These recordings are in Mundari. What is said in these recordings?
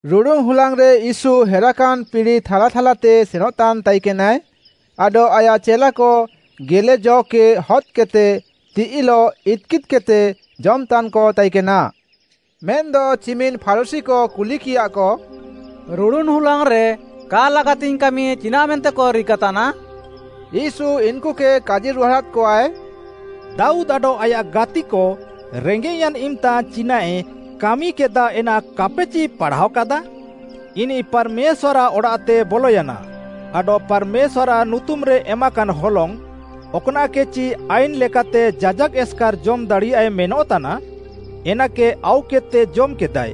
ରୁଡ଼ୁନ୍‌ ହୁଲାଙ୍ଗ୍‌ରେ ୟୀଶୁ ହେରାକାନ୍‌ ପିଡ଼ି ଥାଲାଥାଲାତେ ସେନଃତାନ୍‌ ତାଇକେନାଏ, ଆଡଃ ଆୟାଃ ଚେଲାକ ଗେଲେ ଜ'କେ ହଦ୍‌କେଦ୍‌ତେ ତିଃଇଲଃ ଇତ୍‌କିଦ୍‌କେଦ୍‌ତେ ଜମ୍‌ତାନ୍‌କ ତାଇକେନା। ମେନ୍‌ଦ ଚିମିନ୍‌ ଫାରୁଶୀକ କୁଲିକିୟାଃକ, “ରୁଡ଼ୁନ୍‌ ହୁଲାଙ୍ଗ୍‌ରେ କା ଲାଗାତିଙ୍ଗ୍‌ କାମି ଚିନାଃମେନ୍ତେକ ରିକାତାନା?” ୟୀଶୁ ଇନ୍‌କୁକେ କାଜିରୁହାଡ଼ାଦ୍‌କଆଏ, “ଦାଉଦ୍‌ ଆଡଃ ଆୟାଃ ଗାତିକ ରେଙ୍ଗେଃୟାନ୍‌ ଇମ୍‌ତା ଚିନାଃଏ କାମିକେଦାଃ ଏନା କାପେଚି ପାଢ଼ାୱାକାଦାଃ? ଇନିଃ ପାର୍‌ମେଶ୍ୱାର୍‌ଆଃ ଅଡ଼ାଃତେ ବଲୟାନା, ଆଡଃ ପାର୍‌ମେଶ୍ୱାର୍‌ଆଃ ନୁତୁମ୍‌ରେ ଏମାକାନ୍‌ ହଲଙ୍ଗ୍‌, ଅକ୍‌ନାଃକେଚି ଆଇନ୍‌ ଲେକାତେ ଯାଜାକ୍‌ ଏସ୍‌କାର୍‌ ଜମ୍ ଦାଡ଼ିୟାଏ ମେନଃତାନା, ଏନାକେ ଆଉକେଦ୍‌ତେ ଜମ୍‌କେଦାଏ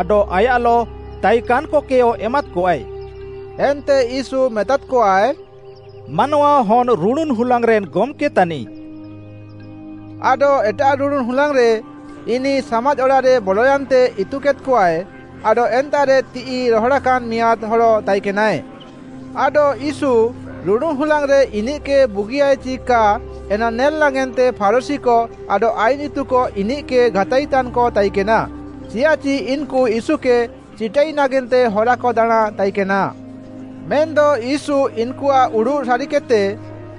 ଆଡଃ ଆୟାଃଲଃ ତାଇକାନ୍‌କକେୟ ଏମାଦ୍‌କଆଏ।” ଏନ୍ତେ ୟୀଶୁ ମେତାଦ୍‌କଆଏ, “ମାନୱାହନ୍‌ ରୁଡ଼ୁନ୍‌ ହୁଲାଙ୍ଗ୍‌ରେନ୍ ଗମ୍‌କେ ତାନିଃ।” ଆଡଃ ଏଟାଃ ରୁଡ଼ୁନ୍‌ ହୁଲାଙ୍ଗ୍‌ରେ ଇନିଃ ସାମାଜ୍‌ ଅଡ଼ାଃରେ ବଲୟାନ୍ତେ ଇତୁକେଦ୍‌କଆଏ, ଆଡଃ ଏନ୍ତାଃରେ ତିଃଇ ରହଡ଼ାକାନ୍‌ ମିଆଁଦ୍‌ ହଡ଼ ତାଇକେନାଏ। ଆଡଃ ୟୀଶୁ ରୁଡ଼ୁନ୍‌ ହୁଲାଙ୍ଗ୍‌ରେ ଇନିଃକେ ବୁଗିୟାଏ ଚି କା ଏନା ନେଲ୍‌ ନାଗେନ୍ତେ ଫାରୁଶୀକ ଆଡଃ ଆଇନ୍‌ ଇତୁକ ଇନିଃକେ ଘାତାଇତାନ୍‌କ ତାଇକେନା ଚିୟାଃଚି ଇନ୍‌କୁ ୟୀଶୁକେ ଚିଟାଇ ନାଗେନ୍ତେ ହରାକ ଦାଣାଁଁ ତାଇକେନା। ମେନ୍‌ଦ ୟୀଶୁ ଇନ୍‌କୁଆଃ ଉଡ଼ୁଃ ସାରିକେଦ୍‌ତେ,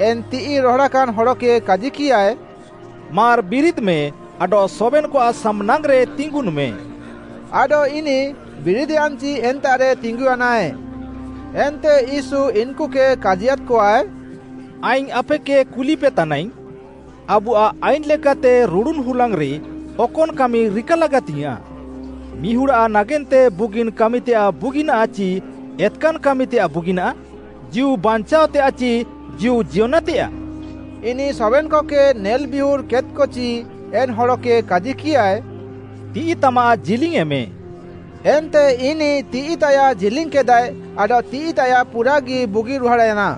ଏନ୍‌ ତିଃଇ ରହଡ଼ାକାନ୍ ହଡ଼କେ କାଜିକିୟାଏ, “ମାର୍‌ ବିରିଦ୍‌ମେ ଆଡଃ ସବେନ୍‌କଆଃ ସାମ୍‌ନାଙ୍ଗ୍‌ରେ ତିଙ୍ଗୁନ୍‌ମେ, ଆଡଃ ଇନିଃ ବିରିଦ୍‌ୟାନ୍‌ଚି ଏନ୍ତାଃରେ ତିଙ୍ଗୁୟାନାଏ।” ଏନ୍ତେ ୟୀଶୁ ଇନ୍‌କୁକେ କାଜିୟାଦ୍‌କଆଏ, “ଆଇଙ୍ଗ୍‌ ଆପେକେ କୁଲିପେତାନାଇଙ୍ଗ୍‌, ଆବୁଆଃ ଆଇନ୍‌ଲେକାତେ ରୁଡ଼ୁନ୍‌ ହୁଲାଙ୍ଗ୍‌ରେ ଅକନ୍‌ କାମି ରିକା ଲାଗାତିଙ୍ଗ୍‌ୟାଁଃ? ମିହୁଡ଼୍‌ଆଃ ନାଗେନ୍ତେ ବୁଗିନ୍‌ କାମିତେୟାଃ ବୁଗିନାଃ ଚି ଏତ୍‌କାନ୍‌ କାମିତେୟାଃ ବୁଗିନାଃ? ଜୀଉ ବାଞ୍ଚାଅତେୟାଃ ଚି ଜୀଉ ଜିୟନେତେୟାଃ?” ଇନିଃ ସବେନ୍‌କକେ ନେଲ୍‌ବିୟୁର୍ କେଦ୍‌କଚି ଏନ୍‌ ହଡ଼କେ କାଜିକିୟାଏ, “ତିଃଇତାମାଃ ଜିଲିଙ୍ଗ୍‌ୟେଁମେ।” ଏନ୍ତେ ଇନିଃ ତିଃଇତାୟାଃ ଜିଲିଙ୍ଗ୍‌କେଦାଏ ଆଡଃ ତିଃଇତାୟାଃ ପୁରାଗି ବୁଗିରୁହାଡ଼୍‌ୟାନା।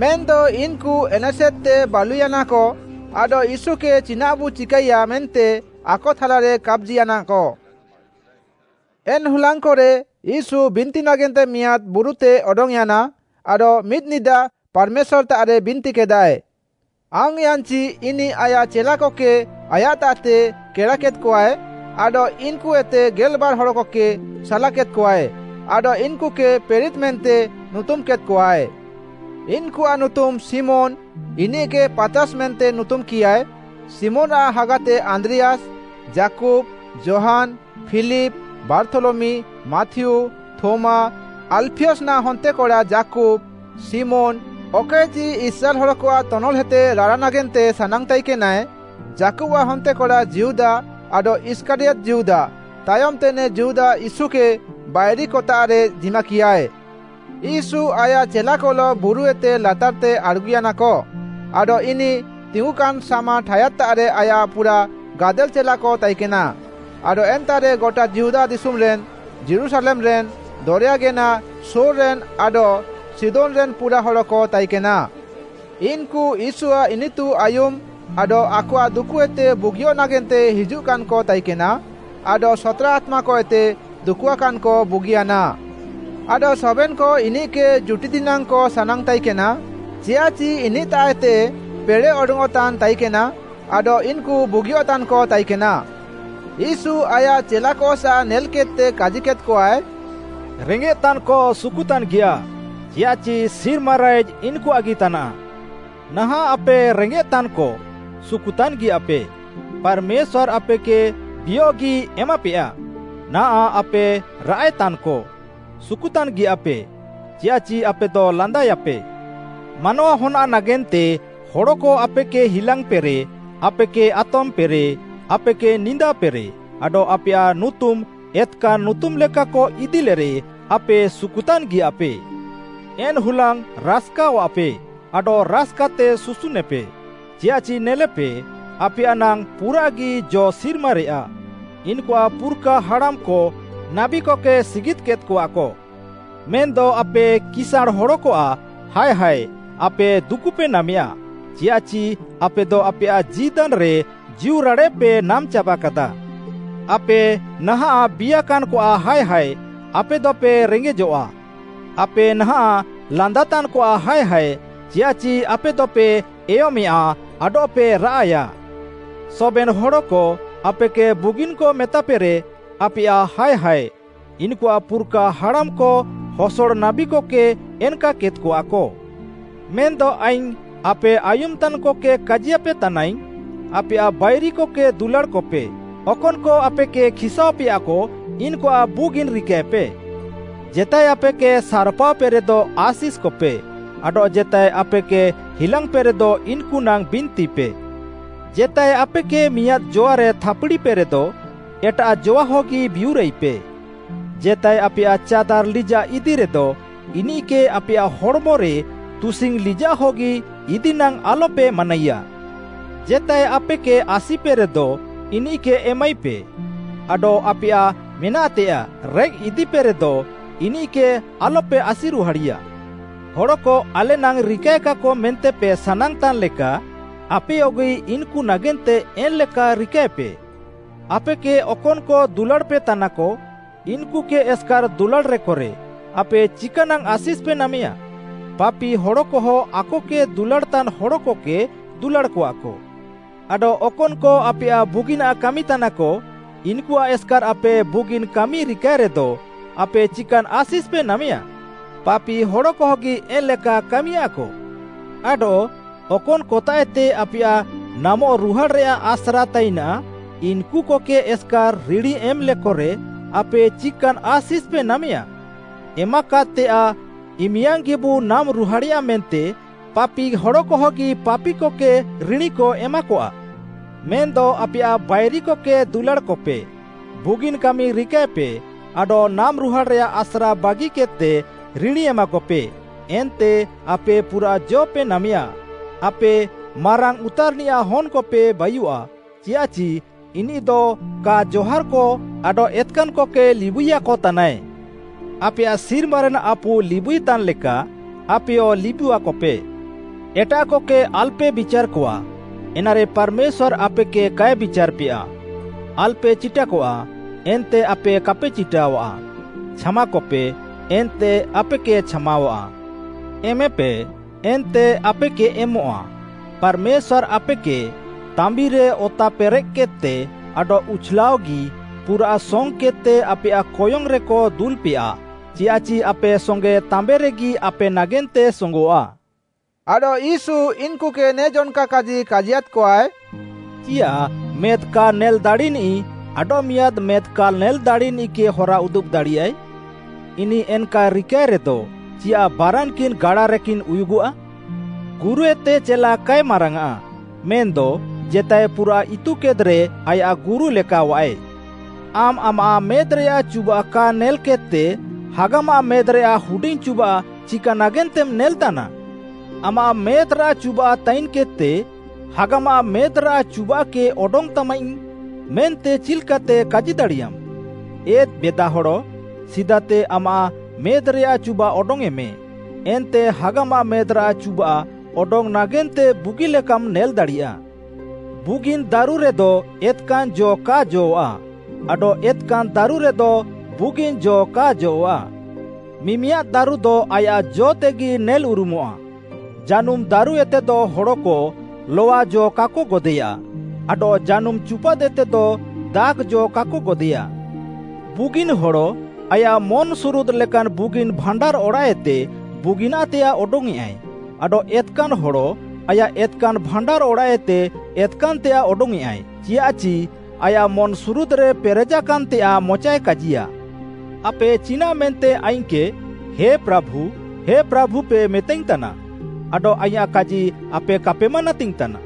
ମେନ୍‌ଦ ଇନ୍‌କୁ ଏନେସେଦ୍‌ତେ ବାଲୁୟାନାକ, ଆଡଃ ୟୀଶୁକେ ଚିନାଃବୁ ଚିକାଇୟା ମେନ୍ତେ ଆକଥାଲାରେ କାପାଜିୟାନାକ। ଏନ୍‌ ହୁଲାଙ୍ଗ୍‌କରେ ୟୀଶୁ ବିନ୍ତି ନାଗେନ୍ତେ ମିଆଁଦ୍‌ ବୁରୁତେ ଅଡଙ୍ଗ୍‌ୟାନା, ଆଡଃ ମିଦ୍‌ନିଦା ପାର୍‌ମେଶ୍ୱାର୍‌ତାଃରେ ବିନ୍ତିକେଦାଏ। ଆଙ୍ଗ୍‌ୟାନ୍‌ଚି ଇନିଃ ଆୟାଃ ଚେଲାକକେ ଆୟାଃତାଃତେ କେଡ଼ାକେଦ୍‌କଆଏ ଆଡଃ ଇନ୍‌କୁଏତେ ଗେଲ୍‌ବାର୍‌ ହଡ଼କକେ ସାଲାକେଦ୍‌କଆଏ, ଆଡଃ ଇନ୍‌କୁକେ ପ୍ରେରିତ୍‌ ମେନ୍ତେ ନୁତୁମ୍‌କେଦ୍‌କଆଏ। ଇନ୍‌କୁଆଃ ନୁତୁମ୍‌ ଶିମୋନ୍‌, ଇନିଃକେ ପାତ୍‌ରାସ୍‌ ମେନ୍ତେ ନୁତୁମ୍‌କିୟାଏ, ଶିମୋନ୍‌ଆଃ ହାଗାତେ ଆନ୍ଦ୍ରିୟାସ୍‌, ଯାକୁବ୍‌, ଯୋହାନ୍‌, ଫିଲିପ୍‌, ବାର୍ଥୋଲମି, ମାଥିଉ, ଥୋମା, ଆଲ୍‌ଫିୟନାଃ ହନ୍ତେକଡ଼ା ଯାକୁବ୍‌, ଶିମୋନ୍‌, ଅକଏଚି ଇସ୍ରାଏଲ୍‌ ହଡ଼କଆଃ ତନଲ୍‌ହେତେ ରାଡ଼ା ନାଗେନ୍ତେ ସାନାଙ୍ଗ୍‌ ତାଇକେନାଏ, ଯାକୁବ୍‌ଆଃ ହନ୍ତେକଡ଼ା ଯିହୁଦା, ଆଡଃ ଇଷ୍କାରିୟତ୍‌ ଯିହୁଦା, ତାୟମ୍‌ତେ ନେ ଯିହୁଦା ୟୀଶୁକେ ବାଇରିକତାଃରେ ଜିମାକିୟାଏ। ୟୀଶୁ ଆୟାଃ ଚେଲାକଲଃ ବୁରୁଏତେ ଲାତାର୍‌ତେ ଆଡ଼୍‌ଗୁୟାନାକ। ଆଡଃ ଇନିଃ ତିଙ୍ଗୁକାନ୍‌ ସାମ୍‌ ଠାୟାଦ୍‌ତାଃରେ ଆୟାଃ ପୁରାଃ ଗାଦେଲ୍‌ ଚେଲାକ ତାଇକେନା ଆଡଃ ଏନ୍ତାଃରେ ଗଟା ଯିହୁଦା ଦିଶୁମ୍‌ରେନ୍, ଯୀରୁଶାଲେମ୍‌ରେନ୍, ଦରେୟାଗେନା ସୋର୍‌ରେନ୍ ଆଡଃ ସିଦୋନ୍‌ରେନ୍‌ ପୁରାଃ ହଡ଼କ ତାଇକେନା। ଇନ୍‌କୁ ୟୀଶୁଆଃ ଇନିତୁ ଆୟୁମ୍‌ ଆଡଃ ଆକଆଃ ଦୁକୁଏତେ ବୁଗିୟଃ ନାଗେନ୍ତେ ହିଜୁଃକାନ୍‌କ ତାଇକେନା। ଆଡଃ ସତ୍‌ରା ଆତ୍ମାକଏତେ ଦୁକୁଆକାନ୍‌କ ବୁଗିୟାନା ଆଡଃ ସବେନ୍‌କ ଇନିଃକେ ଜୁଟିଦିନାଙ୍ଗ୍‌କ ସାନାଙ୍ଗ୍‌ ତାଇକେନା, ଚିୟାଃଚି ଇନିଃତାଃଏତେ ପେଡ଼େଃ ଅଡଙ୍ଗ୍‌ଅଃତାନ୍‌ ତାଇକେନା ଆଡଃ ଇନ୍‌କୁ ବୁଗିଅଃତାନ୍‌କ ତାଇକେନା। ୟୀଶୁ ଆୟାଃ ଚେଲାକସାଃ ନେଲ୍‌କେଦ୍‌ତେ କାଜିକେଦ୍‌କଆଏ, “ରେଙ୍ଗେଃତାନ୍‌କ ସୁକୁତାନ୍‌ଗିୟାଃ; ଚିୟାଃଚି ସିର୍ମା ରାଇଜ୍‌ ଇନ୍‌କୁଆଃଗି ତାନାଃ। ନାହାଁଃ ଆପେ ରେଙ୍ଗେଃତାନ୍‌କ, ସୁକୁତାନ୍‌ ଗିୟାଃପେ, ପାର୍‌ମେଶ୍ୱାର୍‌ ଆପେକେ ବିୟଃଗି ଏମାପେୟା! ନାଆଃ ଆପେ ରାଆଃଏ ତାନ୍‌କ, ସୁକୁତାନ୍‌ ଗିୟାଃପେ, ଚିୟାଃଚି ଆପେଦ ଲାନ୍ଦାଏୟାପେ। “ମାନୱାହନ୍‌ଆଃ ନାଗେନ୍ତେ ହଡ଼କ ଆପେକେ ହିଲାଙ୍ଗ୍‌ପେରେ, ଆପେକେ ଆତମ୍‌ପେରେ, ଆପେକେ ନିନ୍ଦାପେରେ ଆଡଃ ଆପେୟାଃ ନୁତୁମ୍‌ ଏତ୍‌କାନ୍‌ ନୁତୁମ୍‌ଲେକାକ ଇଦିଲେରେ ଆପେ ସୁକୁତାନ୍‌ ଗିୟାଃପେ। ଏନ୍‌ ହୁଲାଙ୍ଗ୍‌ ରାସ୍‌କାଅଃପେ ଆଡଃ ରାସ୍‌କାତେ ସୁସୁନ୍‌ନେପେ, ଚିୟାଃଚି ନେଲେପେ, ଆପେୟାଃ ନାଙ୍ଗ୍‌ ପୁରାଗି ଜ ସିର୍ମାରେୟା। ଇନ୍‌କୁଆଃ ପୁର୍‌ଖାହାଡ଼ାମ୍‌କ ନାବୀକକେ ସିଗିଦ୍‌କେଦ୍‌କଆକ। “ମେନ୍‌ଦ ଆପେ କିସାଁଣ୍‌ ହଡ଼କଆଃ ହାୟ ହାୟ ଆପେ ଦୁକୁପେ ନାମେୟା, ଚିୟାଃଚି ଆପେଦ ଆପେୟାଃ ଜୀଦାନ୍‌ରେ ଜୀଉରାଡ଼େଃପେ ନାମ୍‌ଚାବାକାଦାଃ। ଆପେ ନାହାଁଃ ବିୟାକାନ୍‌କଆଃ ହାୟ ହାୟ, ଆପେଦପେ ରେଙ୍ଗେଜଆଃ। ଆପେ ନାହାଁଃ ଲାନ୍ଦାତାନ୍‌କଆଃ ହାୟ ହାୟ, ଚିୟାଃଚି ଆପେଦପେ ଏୟମେଁୟା ଆଡଃପେ ରାଆଃୟା। “ସବେନ୍‌ ହଡ଼କ ଆପେକେ ବୁଗିନ୍‌କ ମେତାପେରେ, ଆପେୟାଃ ହାୟ ହାୟ, ଇନ୍‌କୁଆଃ ପୁର୍‌ଖାହାଡ଼ାମ୍‌କ ହସଡ଼ ନାବୀକକେ ଏନ୍‌କାକେଦ୍‌କଆକ। “ମେନ୍‌ଦ ଆଇଙ୍ଗ୍‌ ଆପେ ଆୟୁମ୍‌ତାନ୍‌କକେ କାଜିୟାପେ ତାନାଇଙ୍ଗ୍‌, ଆପେୟାଃ ବାଇରିକକେ ଦୁଲାଡ଼୍‌କପେ, ଅକନ୍‌କ ଆପେକେ ଖିସ୍‌ସାଅପେୟାକ ଇନ୍‌କୁଆଃ ବୁଗିନ୍‌ ରିକାଏପେ। ଜେତାଏ ଆପେକେ ସାର୍‌ପାଅପେକ, ଆଶିଷ୍‌କପେ, ଆପେକେ ହିଲାଙ୍ଗ୍‌ପେକ, ବିନ୍ତିପେ। ଜେତାଏ ଆପେକେ ମିଆଁଦ୍‌ ଜଆରେ ଥାପ୍‌ଡ଼ିପେରେଦ, ଏଟାଃ ଜୱାହଗି ବିୟୁରାଇପେ। ଜେତାଏ ଆପେୟାଃ ଚାଦାର୍‌ ଲିଜାଃ ଇଦିରେଦ, ଇନିଃକେ ଆପେୟାଃ ହଡ଼୍‌ମରେ ତୁସିଙ୍ଗ୍‌ ଲିଜାଃ ହଗି ଇଦିନାଙ୍ଗ୍‌ ଆଲପେ ମାନାଇୟାଃ। ଜେତାଏ ଆପେକେ ଆସିପେରେଦ ଇନିଃକେ ଏମାଇପେ, ଆଡଃ ଆପେୟାଃ ମେନାଃତେୟାଃ ରେଃକ୍‌ଇଦିପେରେଦ, ଇନିଃକେ ଆଲପେ ଆସିରୁହାଡ଼ିୟାଃ। ହଡ଼କ ଆଲେନାଙ୍ଗ୍‌ ରିକାଏକାକ ମେନ୍ତେପେ ସାନାଙ୍ଗ୍‌ତାନ୍‌ ଲେକା, ଆପେୟଗି ଇନ୍‌କୁ ନାଗେନ୍ତେ ଏନ୍‌ଲେକା ରିକାଏପେ। “ଆପେକେ ଅକନ୍‌କ ଦୁଲାଡ଼୍‌ପେତାନାକ ଇନ୍‌କୁକେ ଏସ୍‌କାର୍‌ ଦୁଲାଡ଼୍‌ରେକରେ, ଆପେ ଚିକା ନାଙ୍ଗ୍‌ ଆଶିଷ୍‌ପେ ନାମେୟା? ପାପି ହଡ଼କହ ଆକକେ ଦୁଲାଡ଼୍‌ତାନ୍‌ ହଡ଼କକେ ଦୁଲାଡ଼୍‌କଆକ। ଆଡଃ ଅକନ୍‌କ ଆପେୟାଃ ବୁଗିନାଃ କାମିତାନାକ, ଇନ୍‌କୁଆଃ ଏସ୍‌କାର୍‌ ଆପେ ବୁଗିନ୍‌ କାମିପେ ରିକାଏ ରେଦ, ଆପେ ଚିକାନ୍‌ ଆଶିଷ୍‌ପେ ନାମେୟା? ପାପି ହଡ଼କହଗି ଏନ୍‌ଲେକା କାମିୟାଃକ। ଆଡଃ ଅକନ୍‌ କତାଃଏତେ ଆପେୟାଃ ନାମଃ ରୁହାଡ଼୍‌ରେୟାଃ ଆସ୍ରା ତାଇନାଃ, ଇନ୍‌କୁକେ ଏସ୍‌କାର୍‌ ରିଣୀ ଏମ୍‌ଲେକରେ ଆପେ ଚିକାନ୍‌ ଆଶିଷ୍‌ପେ ନାମେୟା? ଏମାକାଦ୍‌ତେୟାଃ ଇମିୟାଙ୍ଗ୍‌ଗିବୁ ନାମ୍‌ରୁହାଡ଼େୟାଃ ମେନ୍ତେ ପାପି ହଡ଼କହଗି ପାପିକକେ ରିଣୀକ ଏମାକଆଃ। ମେନ୍‌ଦ ଆପେୟାଃ ବାଇରିକକେ ଦୁଲାଡ଼୍‌କପେ, ବୁଗିନ୍‌ କାମି ରିକାଏପେ ଆଡଃ ନାମ୍‌ରୁହାଡ଼୍‌ରେୟାଃ ଆସ୍ରାବାଗିକେଦ୍‌ତେ ରିଣୀ ଏମାକପେ ଏନ୍ତେ ଆପେ ପୁରାଃ ଜ'ପେ ନାମେୟା, ଆପେ ମାରାଙ୍ଗ୍‌ ଉତାର୍‌ନିୟାଃ ହନ୍‌କପେ ବାୟୁଃଆ, ଚିୟାଃଚି ଇନିଃଦ କା ଜହାର୍‌କ ଆଡଃ ଏତ୍‌କାନ୍‌କକେ ଲିବୁଇୟାକତାନାଏ। ଆପେୟାଃ ସିର୍ମାରେନ୍‌ ଆପୁ ଲିବୁଇତାନ୍‌ ଲେକା, ଆପେୟ ଲିବୁଆକପେ। “ଏଟାଃକକେ ଆଲ୍‌ପେ ବିଚାର୍‌କଆ, ଏନାରେ ପାର୍‌ମେଶ୍ୱାର୍‌ ଆପେକେ କାଏ ବିଚାର୍‌ପେୟା, ଆଲ୍‌ପେ ଚିଟାକଆ, ଏନ୍ତେ ଆପେ କାପେ ଚିଟାଃୱା। ଛାମାକପେ, ଏନ୍ତେ ଆପେକେ ଛାମାୱାଃ। ଏମେପେ, ଏନ୍ତେ ଆପେକେ ଏମଃଆ, ପାର୍‌ମେଶ୍ୱାର୍‌ ଆପେକେ, ତାମ୍ବିରେ ଅତାପେରେଃକେଦ୍‌ତେ, ଆଡଃ ଉଛ୍‌ଲାଅଃଗି ପୁରାଃ ସଙ୍ଗ୍‌କେଦ୍‌ତେ ଆପେୟାଃ କୟଙ୍ଗ୍‌ରେକ ଦୁଲାପେୟା ଚିୟାଃଚି ଆପେ ସଙ୍ଗେ ତାମ୍ବିରେଗି ଆପେ ନାଗେନ୍ତେ ସୋଙ୍ଗଃଆ।” ଆଡଃ ୟୀଶୁ ଇନ୍‌କୁକେ ନେ ଜନ୍‌କା କାଜି କାଜିୟାଦ୍‌କଆଏ, “ଚିୟାଃ ମେଦ୍‌ କା ନେଲ୍‌ ଦାଡ଼ିନିଃ, ଆଡଃ ମିଆଁଦ୍‌ ମେଦ୍‌ କା ନେଲ୍‌ ଦାଡ଼ିନିଃକେ ହରା ଉଦୁବ୍‌ ଦାଡ଼ିୟାଃଏ? ଇନିଃ ଏନ୍‌କା ରିକାଏରେଦ, ଚିୟାଃ ବାରାନ୍‌କିନ୍‌ ଗାଡାରେକିନ୍ ଉୟୁଗଃଆ? ଗୁରୁଏତେ ଚେଲା କାଏ ମାରାଙ୍ଗ୍‌ଆଃ, ମେନ୍‌ଦ ଜେତାଏ ପୁରା ଇତୁକେଦ୍‌ରେ ଆୟାଃ ଗୁରୁ ଲେକାଅଆଏ। “ଆମ୍‌ ଆମାଃ ମେଦ୍‌ରେଆଃ ଚୁବାଃ କା ନେଲ୍‌କେଦ୍‌ତେ ହାଗାମାଃ ମେଦ୍‌ରେଆଃ ହୁଡିଙ୍ଗ୍‌ ଚୁବାଃ ଚିକା ନାଗେନ୍ତେମ୍‌ ନେଲେତାନା? ଆମାଃ ମେଦ୍‍ରେ ଚୁବାଃ ତାଇନ୍‌କେଦ୍‌ତେ, ‘ହାଗାମାଃ ମେଦ୍‌ରେଆଃ ଚୁବାଃକେ ଅଡଙ୍ଗ୍‌ତାମାଇଙ୍ଗ୍‌’ ମେନ୍ତେ ଚିଲ୍‌କାତେ କାଜି ଦାଡ଼ିୟାମ୍‌? ଏ ବେଦାହଡ଼, ସିଦାତେ ଆମାଃ ମେଦ୍‌ରେଆଃ ଚୁବାଃ ଅଡଙ୍ଗ୍‌ୟେଁମେ, ଏନ୍ତେ ହାଗାମାଃ ମେଦ୍‌ରାଃ ଚୁବାଃ ଅଡଙ୍ଗ୍‌ ନାଗେନ୍ତେ ବୁଗିଲେକାମ୍‌ ନେଲ୍‌ଦାଡ଼ିୟା। “ବୁଗିନ୍‌ ଦାରୁରେଦ ଏତ୍‌କାନ୍‌ ଜ କା ଜଅଃ'ଆଃ, ଆଡଃ ଏତ୍‌କାନ୍‌ ଦାରୁରେଦ ବୁଗିନ୍‌ ଜ କା ଜଅଃ'ଆଃ। ମିମିଆଦ୍ ଦାରୁଦ ଆୟାଃ ଜ'ତେଗି ନେଲ୍‌ଉରୁମଃଆ। ଜାନୁମ୍‌ ଦାରୁଏତେଦ ହଡ଼କ ଲଆ ଜ କାକ ଗଦେୟା ଆଡଃ ଜାନୁମ୍‌ ଚୁପାଦ୍‌ଏତେଦ ଦାଖ୍‌ ଜ କାକ ଗଦେୟା। ବୁଗିନ୍‌ ହଡ଼ ଆୟାଃ ମନ୍‌ସୁରୁଦ୍‌ ଲେକାନ୍‌ ବୁଗିନ୍‌ ଭାଣ୍ଡାର୍‌ଅଡ଼ାଃଏତେ ବୁଗିନାଃ ତେୟାଃ ଅଡଙ୍ଗ୍‌ୟେଁଆଏ ଆଡଃ ଏତ୍‌କାନ୍‌ ହଡ଼ ଆୟାଃ ଏତ୍‌କାନ୍‌ ଭାଣ୍ଡାର୍‌ଅଡ଼ାଃଏତେ ଏତ୍‌କାନ୍‌ତେୟାଃ ଅଡଙ୍ଗ୍‌ୟେଁଆଏ। ଚିଆଃଚି ଆୟାଃ ମନ୍‌ସୁରୁଦ୍‌ରେ ପେରେଜାକାନ୍‌ତେୟାଃ ମଚାଏ କାଜିୟା। “ଆପେ ଚିନାଃମେନ୍ତେ ଆଇଙ୍ଗ୍‌କେ, ‘ହେ ପ୍ରାଭୁ, ହେ ପ୍ରାଭୁପେ,’ ମେତାଇଙ୍ଗ୍‌ତାନା ଆଡଃ ଆଇଁୟାଃ କାଜି ଆପେ କାପେ ମାନାତିଙ୍ଗ୍‌ତାନା?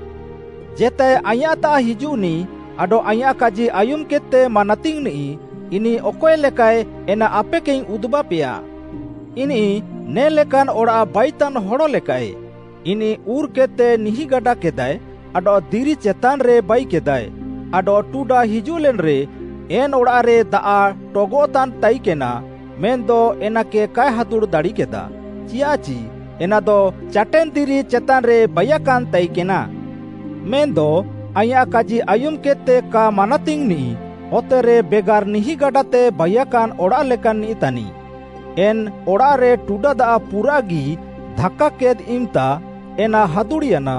ଜେତାଏ ଆଇଁୟାଃତାଃ ହିଜୁଃନିଃ ଆଡଃ ଆଇଁୟାଃ କାଜି ଆୟୁମ୍‌କେଦ୍‌ତେ ମାନାତିଙ୍ଗ୍‌ନିଃ, ଇନିଃ ଅକଏ ଲେକାଃଏ ଏନା ଆପେକେଇଙ୍ଗ୍‌ ଉଦୁବାପେୟା। ଇନିଃ ନେ'ଲେକାନ୍‌ ଅଡ଼ାଃ ବାଇତାନ୍ ହଡ଼ ଲେକାଃଏ, ଇନିଃ ଉର୍‌କେଦ୍‌ତେ ନିହିଁଗାଡ଼ା କେଦାଏ ଆଡଃ ଦିରି ଚେତାନ୍‌ରେ ବାଇକେଦାଏ, ଆଡଃ ଟୁଡା ହିଜୁଃଲେନ୍‌ରେ ଏନ୍‌ ଅଡ଼ାଃରେ ଦାଆଃ ଟଗଃତାନ୍ ତାଇକେନା ମେନ୍‌ଦ ଏନାକେ କାଏ ହାଦୁଡ଼୍‌ ଦାଡ଼ିକେଦା, ଚିୟାଃଚି ଏନାଦ ଚାଟେନ୍‌ ଦିରି ଚେତାନ୍‌ରେ ବାଇୟାକାନ୍‌ ତାଇକେନା। ମେନ୍‌ଦ ଆଇଁୟାଃ କାଜି ଆୟୁମ୍‌କେଦ୍‌ତେ କା ମାନାତିଙ୍ଗ୍‌ନିଃ ଅତେରେ ବେଗାର୍‌ ନିହିଁଗାଡ଼ାତେ ବାଇୟାକାନ୍ ଅଡ଼ାଃ ଲେକାନ୍‌ନିଃ ତାନିଃ, ଏନ୍‌ ଅଡ଼ାଃରେ ଟୁଡା ଦାଆଃ ପୁରାଃଗି ଧାକ୍‌କାକେଦ୍‌ ଇମ୍‌ତା ଏନା ହାଦୁଡ଼୍‌ୟାନା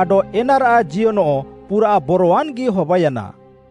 ଆଡଃ ଏନାରାଃ ଜିୟନଃ ପୁରାଃ ବରୱାନ୍‌ଗି ହବାୟାନା।”